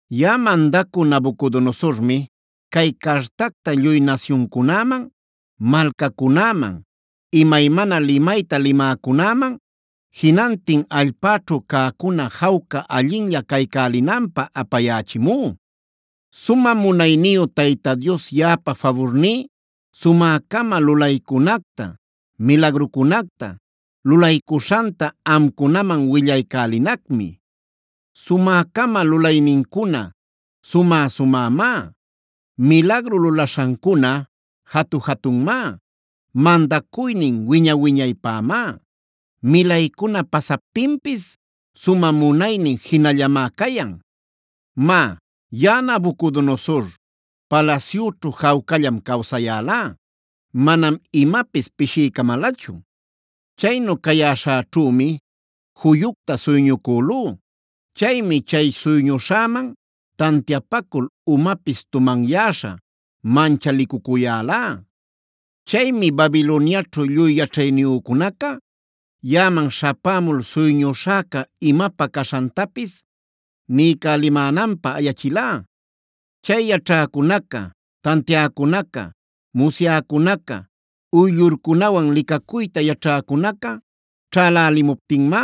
Yaꞌa mandacü Nabucodonosormi cay cartacta lluy nasyuncunäman, malcacunäman, imaymana limayta limäcunäman, jinantin allpäćhu cäcuna jawca allinlla caycälinanpä apayächimú: “Sumä munayniyu Tayta Dios yaꞌapa faburní sumä-cama lulaycunacta, milagrucunacta lulaycuśhanta amcunaman willaycälinacmi. Sumä-cama lulaynincuna sumä-sumämá. Milagru lulaśhancuna jatu-jatunmá. Mandacuynin wiña-wiñaypämá. Milaycuna pasaptinpis sumä munaynin jinallamá cayan. Má, yaꞌa Nabucodonosor palasyüćhu jawcallam cawsayälá; manam imapis pishiycamälachu. Chaynu cayäśhäćhümi juyucta suyñucülú. Chaymi chay suyñuśhäman tantiapacul umapis tumanyäśha manchalicucuyälá. Chaymi Babiloniaćhu lluy yaćhayniyücunaca yaꞌaman śhapämul suyñuśhäca imapä caśhantapis niycälimänanpä ayachilá. Chay yaćhäcunaca, tantiäcunaca, musyäcunaca, uyllurcunawan licacuyta yaćhäcunaca ćhälälimuptinmá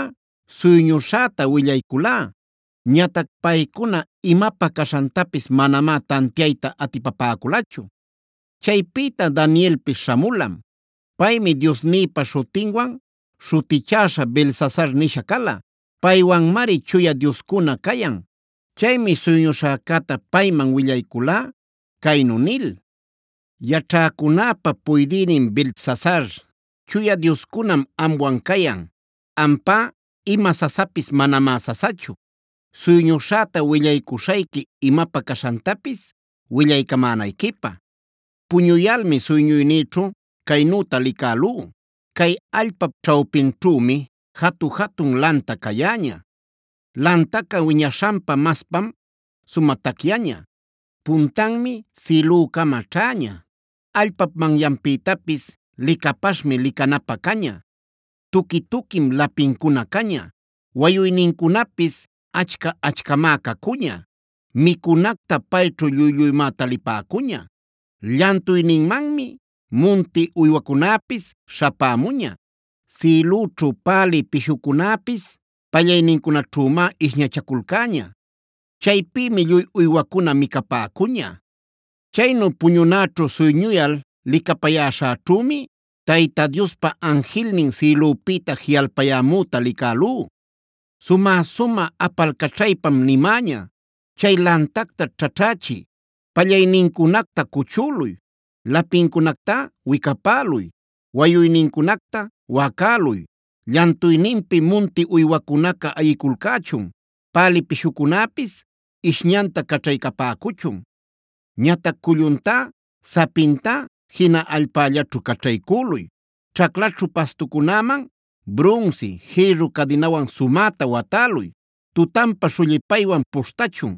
suyñuśhäta willayculá. Ñatac paycuna imapä caśhantapis manamá tantiayta atipapäculachu. Chaypïta Danielpis śhamulam; paymi diosnïpa śhutinwan śhutichäśha Beltsasar nisha cala. Paywanmari chuya dioscuna cayan. Chaymi suyñuśhäcäta payman willayculá caynu nil: ‘Yaćhäcunäpa puydïnin Beltsasar, chuya dioscunam amwan cayan. Ampá ima sasapis manamá sasachu. Suyñuśhäta willaycuśhayqui imapä caśhantapis willaycamänayquipä. Puñuyalmi suyñuynïćhu caynüta licälú: Cay allpap ćhawpinćhümi jatu-jatun lanta cayäña. Lantaca wiñaśhanpa maspam sumä tacyaña. Puntanmi sïlücama ćhäña. Allpap manyanpïtapis licapaśhmi licanapä caña. Tuqui-tuquim lapincuna caña; wayuynincunapis achca-achcamá cacuña; micunacta payćhu lluy-lluymá talipäcuña. Llantuyninmanmi munti uywacunäpis śhapämuña. Sïlüćhu pälï pishucunäpis pallaynincunaćhümá ishñachaculcäña. Chaypïmi lluy uywacuna micapäcuña. Chaynu puñunäćhu suyñuyal licapayäśhäćhümi Tayta Diospa anjilnin sïlüpïta jiꞌalpayämüta licälú. Sumä-sumä apalcaćhaypam nimäña: “Chay lantacta ćhaćhächiy; pallaynincunacta cuchüluy; lapincunacta wicapäluy; wayuynincunacta wacäluy. Llantuyninpi munti uywacunaca ayiculcächun. Pälï pishucunäpis ishñanta caćhaycapäcuchun. Ñatac culluntá, sapintá jina allpällaćhu caćhaycüluy. Ćhaclaćhu pastucunäman brunsi, jïrru cadinawan sumäta watäluy. Tutanpa shullipaywan puśhtachun.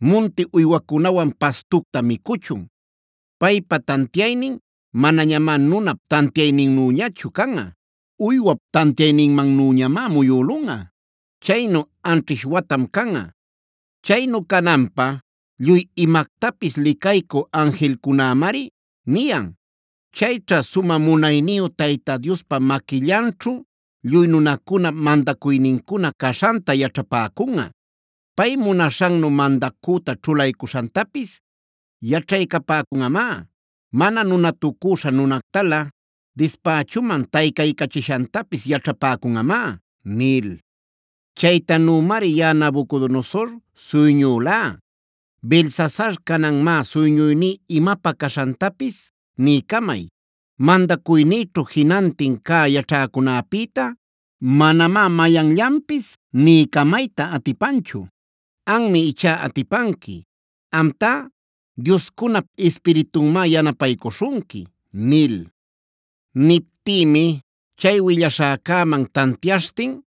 Munti uywacunawan pastucta micuchun. Paypa tantiaynin manañamá nunap tantiayninnüñachu canꞌa. Uywap tantiayninmanüñamá muyülunꞌa. Chaynu anćhish watam canꞌa. Chaynu cananpä lluy imactapis licaycü anjilcunämari niyan. Chayćha sumä munayniyu Tayta Diospa maquillanćhu lluy nunacunap mandacuynincuna caśhanta yaćhapäcunꞌa. Pay munaśhannu mandacüta ćhulaycuśhantapis yaćhaycapäcunꞌamá. Mana nunatucüśha nunactalä dispächuman taycaycachishantapis yaćhapäcunꞌamá” nil. Chaytanümari yaꞌa Nabucodonosor suyñülá. Beltsasar, canan má suyñuyní imapä caśhantapis niycamay. Mandacuynïćhu jinantin cä yaćhäcunäpïta manamá mayanllanpis niycamayta atipanchu. Anmi ichá atipanqui. Amtá, dioscunap ispiritunmá yanapaycuśhunqui’ nil. Niptïmi chay willaśhäcäman tantiaśhtin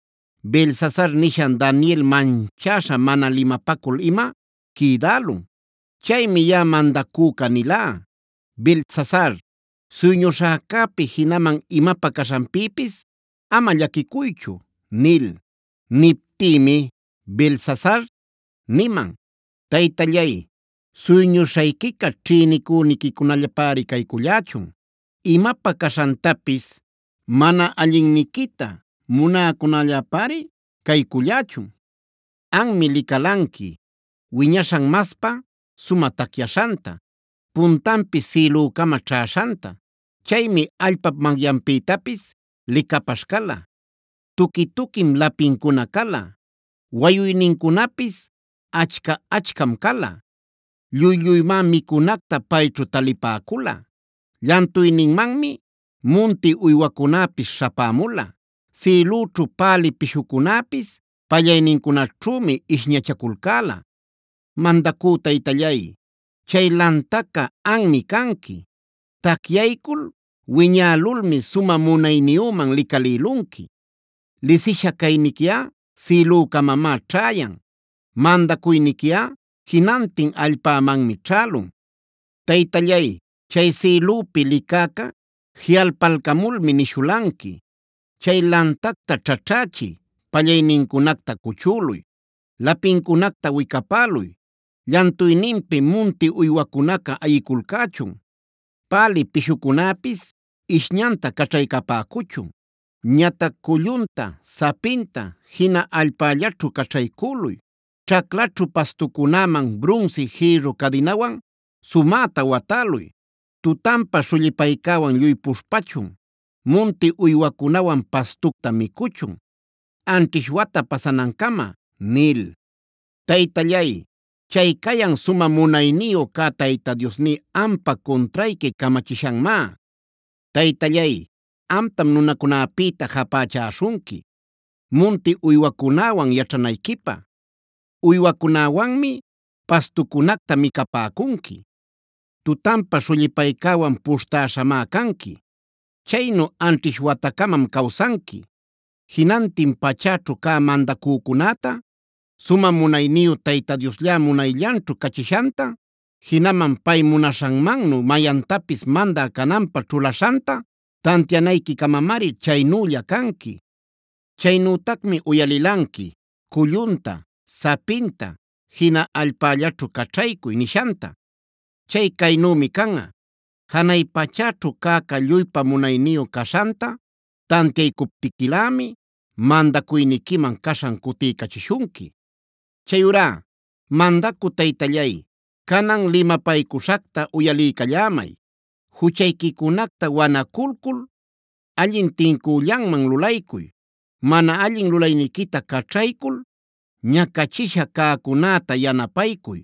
Beltsasar nishan Daniel manchäśha mana limapacul-ima quïdälun. Chaymi yaꞌa mandacüca nilá: ‘Beltsasar, suyñucuśhäcäpi jinaman imapä caśhanpïpis ama llaquicuychu’ nil. Niptïmi Beltsasar niman: ‘Taytallay, suyñuśhayquica ćhïnicüniquicunallapäri caycullächun; imapä caśhantapis mana allinniquita munäcunällapäri caycullächun. Anmi licalanqui, wiñaśhan maspa sumä tacyaśhanta, puntanpis sïlücama ćhäśhanta. Chaymi allpap manyanpïtapis licapaśh cala. Tuqui-tuquim lapincuna cala. Wayuynincunapis achca-achcam cala. Lluy-lluymá micunacta payćhu talipäcula. Llantuyninmanmi munti uywacunäpis śhapämula. Sïlüćhu pälï pishucunäpis pallaynincunaćhümi ishñachaculcäla. Mandacü taytallay, chay lantaca anmi canqui. Tacyaycul wiñälulmi sumä munayniyüman licalïlunqui. Lisisha cayniquiꞌa sïlücamamá ćhäyan. Mandacuyniquiꞌa jinantin allpämanmi ćhälun. Taytallay, chay sïlüpi licäca jiꞌalpalcamulmi nishulanqui: “Chay lantacta ćhachächiy; pallaynincunacta cuchüluy; lapincunacta wicapäluy. Llantuyninpi munti uywacunaca ayiculcächun. Pälï pishucunäpis ishñanta caćhaycapäcuchun. Ñatac cullunta, sapinta jina allpällaćhu caćhaycüluy. Ćhaclaćhu pastucunäman brunsi, jïrru cadinawan sumäta watäluy. Tutanpa shullipaycäwan lluy puśhpachun. Munti uywacunawan pastucta micuchun anćhish wata pasanancama” nil. Taytallay, chay cayan sumä munayniyu cä Tayta Diosní ampa cuntrayqui camachishanmá. Taytallay, amtam nunacunäpïta japächäśhunqui munti uywacunäwan yaćhanayquipä. Uywacunäwanmi pastucunacta micapäcunqui. Tutanpa shullipaycäwan puśhtäśhamá canqui. Chaynu anćhish watacamam cawsanqui. Jinantin pachäćhu cä mandacücunäta sumä munayniyu Tayta Dioslla munayllanćhu cachishanta, jinaman pay munaśhanmannu mayantapis mandä cananpä ćhulaśhanta tantianayquicamamari chaynülla canqui. Chaynütacmi uyalilanqui: “Cullunta, sapinta jina allpällaćhu caćhaycuy” nishanta. Chay caynümi canꞌa: Janay pachäćhu cäca lluypa munayniyu caśhanta tantiaycuptiquilämi mandacuyniquiman caśhan cutiycachishunqui. Chayurá mandacü taytallay, canan limapaycuśhacta uyaliycallämay: Juchayquicunacta wanaculcul allin tincüllanman lulaycuy. Mana allin lulayniquita caćhaycul ñacachisha cäcunäta yanapaycuy.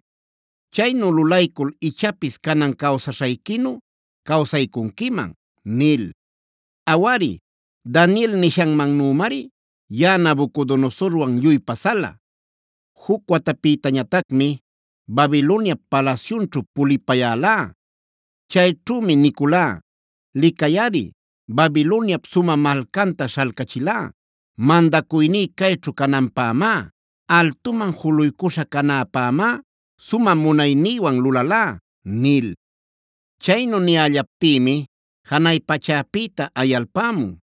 Chaynu lulaycul ichapis canan cawsaśhayquinu cawsaycunquiman’ nil. Awari, Daniel nishanmannümari yaꞌa Nabucodonosorwan lluy pasala. Juc watapïtañatacmi Babiloniap palasyunćhu pulipayälá. Chayćhümi niculá: ‘Licayꞌari, Babiloniap sumä malcanta śhalcachilá mandacuyní cayćhu cananpämá. Altuman juluycuśha canäpämá sumä munaynïwan lulalá’ nil. Chaynu niyällaptïmi janay pachäpïta ayalpämun: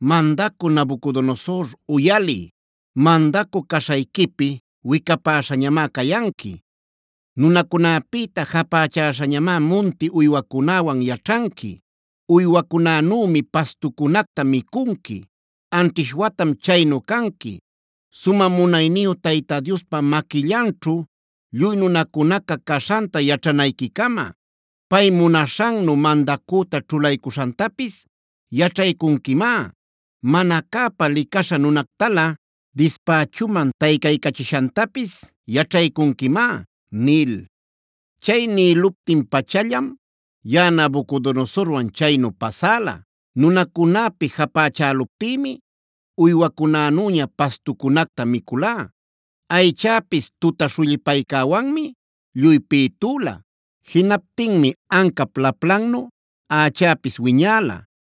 ‘Mandacü Nabucodonosor uyaliy. Mandacü caśhayquipi wicapäśhañamá cayanqui. Nunacunäpïta japächäśhañamá munti uywacunäwan yaćhanqui. Uywacunänümi pastucunacta micunqui. Anćhish watam chaynu canqui, sumä munayniyu Tayta Diospa maquillanćhu lluy nunacunaca caśhanta yaćhanayquicama. Pay munaśhannu mandacüta ćhulaycuśhantapis yaćhaycunquimá. Mana cäpa licaśha nunactalä dispächuman taycaycachishantapis yaćhaycunquimá’ nil. Chay nïluptin-pachallam yaꞌa Nabucodonosorwan chaynu pasäla. Nunacunäpi japächäluptïmi uywacunänüña pastucunacta miculá. Aychäpis tuta shullipaycäwanmi lluy pïtüla. Jinaptinmi ancap laplannu ächäpis wiñäla;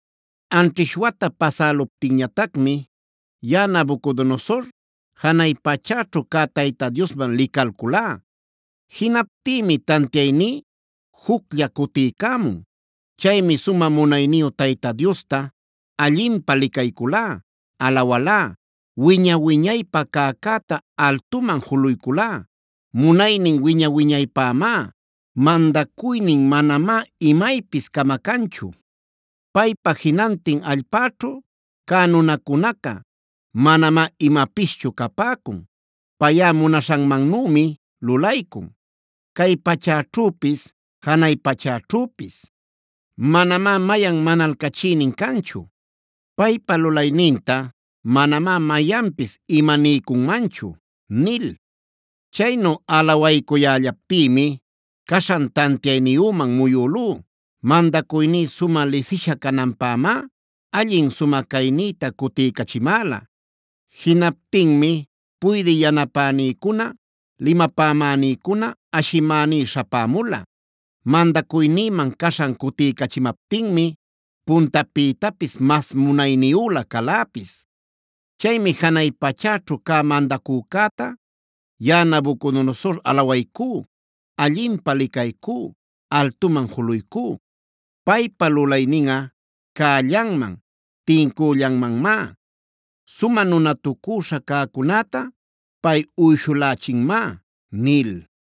Anćhish wata pasäluptinñatacmi yaꞌa Nabucodonosor janay pachäćhu cä Tayta Diosman licalculá. Jinaptïmi tantiayní juclla cutiycämun. Chaymi sumä munayniyu Tayta Diosta allinpä licayculá, alawalá, wiña-wiñaypä cäcäta altuman juluyculá: ‘Munaynin wiña-wiñaypämá. Mandacuynin manamá imaypis camacanchu. Paypá jinantin allpäćhu cä nunacunaca, manamá imapischu capäcun. Payꞌa munaśhanmannümi lulaycun, cay pachäćhüpis, janay pachäćhüpis. Manamá mayan manalcachïnin canchu. Paypa lulayninta manamá mayanpis imaniycunmanchu’ nil. Chaynu alawaycuyällaptïmi caśhan tantiayniyüman muyülú. Mandacuyní sumä lisisha cananpämá allin, sumä caynïta cutiycachimäla. Jinaptinmi puydï yanapänïcuna, limapamänïcuna ashimänï śhapämula. Mandacuynïman caśhan cutiycachimaptinmi puntapïtapis mas munayniyülä caläpis. Chaymi janay pachäćhu cä mandacücäta yaꞌa Nabucodonosor alawaycú, allinpä licaycú, altuman juluycú. Paypa lulayninꞌa cällanman, tincüllanmanmá. Sumä nunatucüśha cäcunäta pay uyshulächinmá” nil.